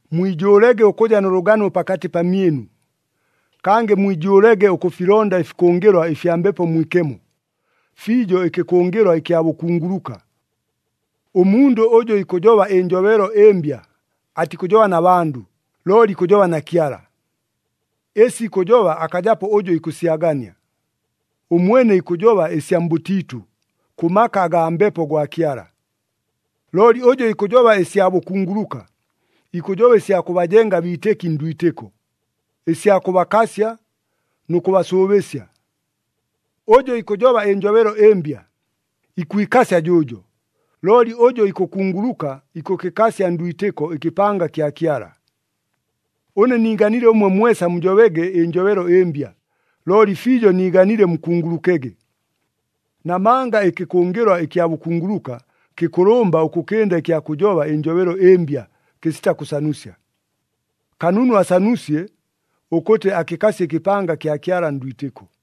Mwijʉʉlege ʉkʉja nʉ lʉgano pakatɨ pamyɨnu, kangɨ mwijʉʉlege ʉkʉfilonda ɨfikʉngɨlwa ɨfya Mbepo Mwikemo, fiijo ɨkɨkʉngɨlwa ɨkya bʉkunguluka. Ʉmundʉ ʉjʉ ikʉjoba ɨnjobelo ɨmbya, atikʉjoba na bandʉ, looli ikʉjoba na Kyala. Ɨsi ikʉjoba akajapo ʉjʉ ikʉsyagania. Ʉmwene ikʉjoba ɨsya mbʉtiitʉ, kʉ maka agaa Mbepo gwa Kyala. Looli ʉjʉ ikʉjoba ɨsya bʉkunguluka, ikʉjoba ɨsya kʉbajenga abiitɨki ndwitɨko, ɨsya kʉbakasya nʉ kʉbasʉʉbɨsya. Ʉjʉ ikʉjoba ɨnjobelo ɨmbya, ikwikasya jʉʉjo, looli ʉjʉ ikʉkunguluka ikʉkɨkasya ndwitɨko ɨkɨpanga kya Kyala. Ʉne niiganile ʉmwe mwesa mujobege ɨnjobelo ɨmbya, looli fiijo niiganile mukungulukege. Namanga ɨkɨkʉngɨlwa ɨkya bʉkunguluka kɨkʉlʉmba ʉkʉkɨnda ɨkya kʉjoba ɨnjobelo ɨmbya, kɨsita kʉsanusya. Kanunu asanusye ʉkʉtɨ akɨkasye ɨkɨpanga kya Kyala ndwitɨko.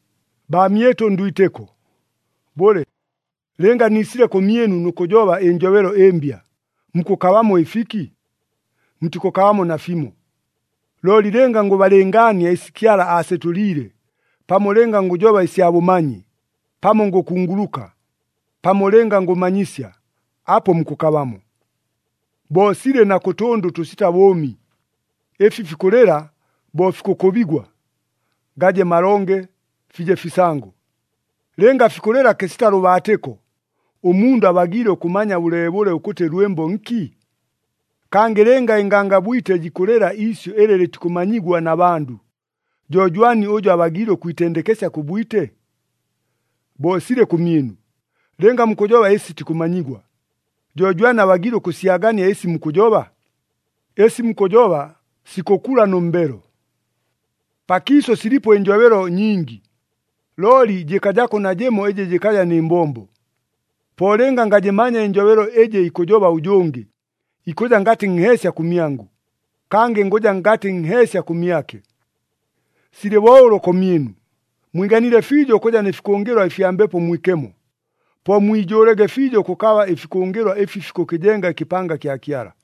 Baamyɨtʉ ndwitɨko, bʉle, lɨnga niisile kʉmyɨnu nʉ kʉjoba ɨnjobelo ɨmbya, mukʉkabamo ɨfiki? Mutikʉkabamo nafimo. Looli lɨnga ngʉbalɨngaania ɨsi Kyala aasetʉliile, pamo lɨnga ngʉjoba ɨsya bʉmanyi, pamo ngʉkunguluka, pamo lɨnga ngʉmanyisya, apo mukʉkabamo. Bo silɨ na kʉ tʉndʉ ʉtʉsita bʉʉmi, ɨfi fikʉlɨla bo fikʉkʉbigwa, gaje malonge, fije fisango. Lɨnga fikʉlɨla kɨsita lʉbaatɨko, ʉmundʉ abagiile ʉkʉmanya bʉleebʉle ʉkʉtɨ lwɨmbo nki? Kangɨ lɨnga ɨngangabwite jikʉlɨla iisyʉ ɨlɨ lɨtikʉmanyigwa na bandʉ, jo jwani ʉjʉ abagiile ʉkwitendekesya kʉ bwite? Bo silɨ kʉmyɨnu. Lɨnga mukʉjoba ɨsi sitikʉmanyigwa, jo jwani abagiile ʉkʉsyagania ɨsi mukʉjoba? Ɨsi mukʉjoba sikʉkula nʉ mbelo! Pakiisʉ silipo ɨnjobelo nyingi, looli jɨkajako najɨmo ɨjɨ jɨkaja nɨ mbombo. Po lɨnga ngajɨmanya ɨnjobelo ɨjɨ ikʉjoba ʉjʉngɨ, ikʉja ngatɨ nheesya kʉmyangʉ, kangɨ ngʉja ngatɨ nheesya kʉmyake. Silɨ bo ʉlo kʉmyɨnu. Mwiganile fiijo ʉkʉja nɨ fikʉngɨlwa ɨfya Mbepo Mwikemo, po mwijʉʉlege fiijo ʉkʉkaba ɨfikʉngɨlwa ɨfi fikʉkɨjenga ɨkɨpanga kya Kyala.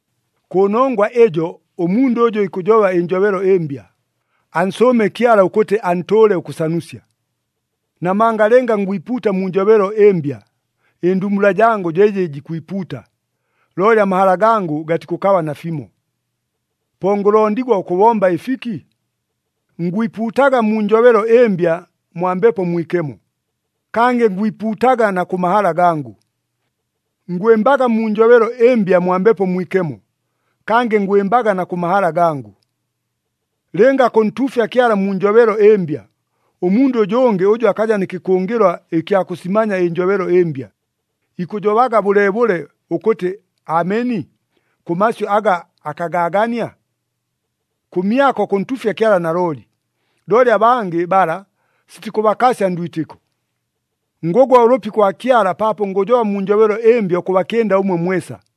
Kʉnongwa ɨjo ʉmundʉ ʉjʉ ikʉjoba ɨnjobelo ɨmbya, ansʉʉme Kyala ʉkʉtɨ antʉʉle ʉkʉsanusya. Namanga lɨnga ngwipuuta mu njobelo ɨmbya, ɨndumbula jangʉ jo ɨjɨ jikwipuuta, looli amahala gangʉ gatikʉkaba nafimo. Po ngʉlondigwa ʉkʉbomba ɨfiki? Ngwipuutaga mu njobelo ɨmbya mwa Mbepo Mwikemo, kangɨ ngwipuutaga na kʉ mahala gangʉ. Ngwɨmbaga mu njobelo ɨmbya mwa Mbepo Mwikemo, kangɨ ngwɨmbaga na kʉ mahala gangʉ. Lɨnga kʉntuufya Kyala mu njobelo ɨmbya, ʉmundʉ ʉjʉngɨ ʉjʉ akaja nɨ kɨkʉngɨlwa ɨkya kʉsimanya ɨnjobelo ɨmbya, ikʉjobaga bʉleebʉle ʉkʉtɨ, “Ameni,” kʉ masyʉ aga akagaagania? Kʉmyako kʉntuufya Kyala nalooli, looli abangɨ bala sitikʉbakasya ndwitɨko. Ngʉgwa ʉlʉpi kwa Kyala paapo ngʉjoba mu njobelo ɨmbya ʉkʉbakɨnda ʉmwe mwesa.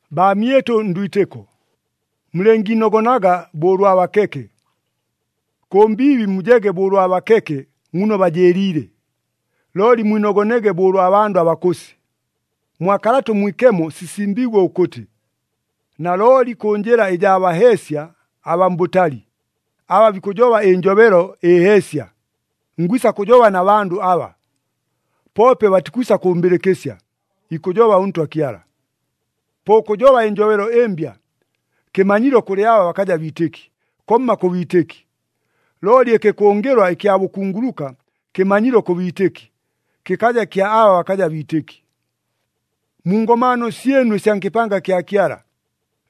Baamyɨtʉ ndwitɨko, mulɨngiinogonaga bo ʉlwa bakeke. Kʉ mbiibi mujege bo ʉlwa bakeke muno bajɨɨliile, looli mwinogonege bo ʉlwa bandʉ abakʉsi. Mwa Kalata ʉMwikemo sisimbiigwe ʉkʉtɨ, “Nalooli kʉ njɨla ɨjaa baheesya abaa mbʉtali, aba bikʉjoba ɨnjobelo ɨheesya, ngwisa kʉjoba na bandʉ aba, poope batikwisa kʉmbɨlɨkɨsya,” ikʉjoba ʉNtwa Kyala. Po ʉkʉjoba ɨnjobelo ɨmbya, kɨmanyilo kʉlɨ aba bakaja biitɨki, komma kʉ biitɨki. Looli ɨkɨkʉngɨlwa ɨkya bʉkunguluka kɨmanyilo kʉ biitɨki, kɨkaja kya aba bakaja biitɨki. Mu ngomaano syɨnu ɨsya nkɨpanga kya Kyala,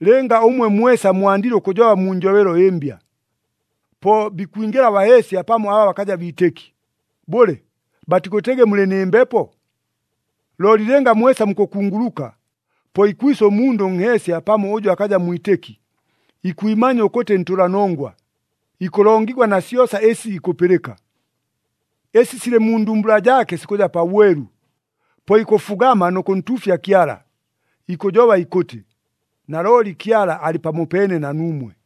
lɨnga ʉmwe mwesa mwandile ʉkʉjoba mu njobelo ɨmbya, po bikwingɨla abaheesya pamo aba bakaja biitɨki, bʉle, batikʉtɨgɨ mulɨ nɨ mbepo? Looli lɨnga mwesa mukʉkunguluka, po ikwisa ʉmundʉ ʉnheesya pamo ʉjʉ akaja mwitɨki, ikwimanya ʉkʉtɨ ntʉlanongwa, ikʉlongigwa na syosa ɨsi ikʉpɨlɨka. Ɨsi silɨ mu ndumbula jaake sikʉja pabwelu, po ikʉfugama nʉ kʉntuufya Kyala, ikʉjoba ikʉtɨ, “Nalooli Kyala alɨ pamopeene na nuumwe!”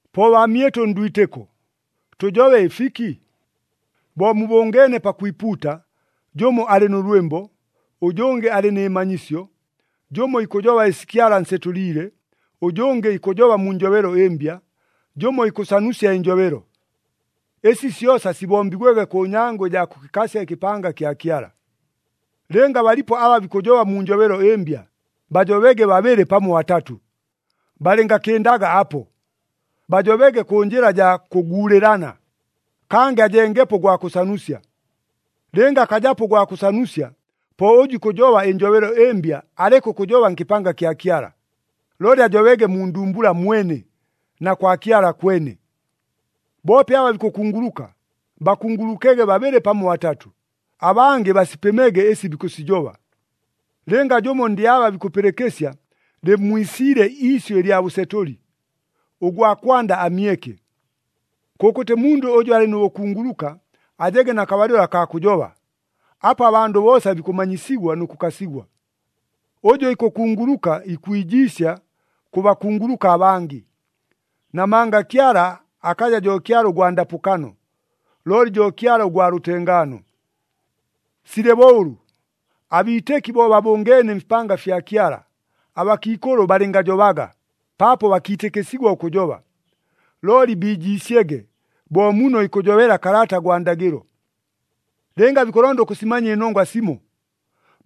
Po baamyɨtʉ ndwitɨko, tʉjobe ɨfiki? Bo mubʉngeene pakwipuuta, jʉmo alɨ nʉ lwɨmbo, ʉjʉngɨ alɨ nɨ manyisyo, jʉmo ikʉjoba ɨsi Kyala ansetʉliile, ʉjʉngɨ ikʉjoba mu njobelo ɨmbya, jʉmo ikʉsanusya ɨnjobelo. Ɨsi syosa sibombigwege kʉ nyango ɨjaa kʉkɨkasya ɨkɨpanga kya Kyala. Lɨnga balipo aba bikʉjoba mu njobelo ɨmbya, bajobege babɨlɨ pamo batatʉ, balɨngakɨndaga apo, bajobege kʉ njɨla jaa kʉguulɨlana, kangɨ ajengepo ʉgwa kʉsanusya. Lɨnga akajapo ʉgwa kʉsanusya, po ʉjʉ ikʉjoba ɨnjobelo ɨmbya aleke ʉkʉjoba nkɨpanga kya Kyala, looli ajobege mu ndumbula mwene, na kwa Kyala kwene. Boope aba bikʉkunguluka, bakungulukege babɨlɨ pamo batatʉ, abangɨ basipɨmege ɨsi bikʉsijoba. Lɨnga jʉmo ndɨ aba bikʉpɨlɨkɨsya, lɨmmwisiile iisyʉ ɨlya bʉsetʉli, ʉgwa kwanda amyeke. Kʉkʉtɨ mundʉ ʉjʉ alɨ nʉ bʉkunguluka, ajege na kabalɨlo akaa kʉjoba, apo abandʉ boosa bikʉmanyisigwa nʉ kʉkasigwa. Ʉjʉ ikʉkunguluka ikwijiisya kʉ bakunguluka abangɨ. Namanga Kyala akaja jo Kyala ʉgwa ndapʉkano, looli jo Kyala ʉgwa lʉtengaano. Silɨ bo ʉlʉ, abiitɨki bo babʉngeene mfipanga fya Kyala, abakiikʉlʉ balɨngajobaga, paapo bakiitɨkɨsigwa ʉkʉjoba. Looli biijiisyege, bo muno ikʉjobela Kalata gwa Ndagɨlo. Lɨnga bikʉlonda ʉkʉsimanya ɨnongwa simo,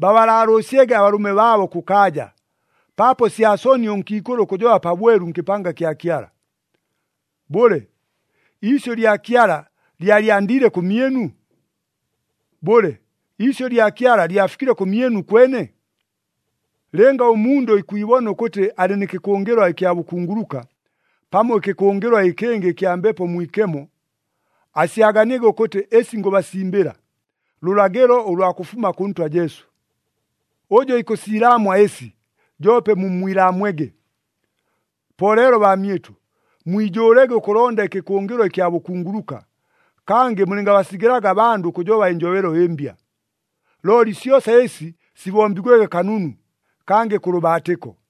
babalaalʉʉsyege abalʉme baabo kʉkaaja, paapo sya soni ʉnkiikʉlʉ ʉkʉjoba pabwelu nkɨpanga kya Kyala. Bʉle, iisyʉ lya Kyala lyalyandiile kʉmyɨnu? Bʉle, iisyʉ lya Kyala lyafikile kʉmyɨnu kwene? Lɨnga ʉmundʉ ikwibona ʉkʉtɨ alɨ nɨ kɨkʉngɨlwa ɨkya bʉkunguluka, pamo ɨkɨkʉngɨlwa ɨkɨngɨ ɨkya Mbepo Mwikemo, asyaganiege ʉkʉtɨ ɨsi ngʉbasimbɨla, lʉlagɨlo ʉlwa kʉfuma kʉ Ntwa Jesu. Ʉjʉ ikʉsiilaamwa ɨsi, joope mummwilaamwege. Po leelo baamyɨtʉ, mwijʉʉlege ʉkʉlonda ɨkɨkʉngɨlwa ɨkya bʉkunguluka, kangɨ mulɨngabasigɨlaga abandʉ ʉkʉjoba ɨnjobelo ɨmbya. Looli syosa ɨsi sibombigwege kanunu, kangɨ kʉ lʉbaatɨko.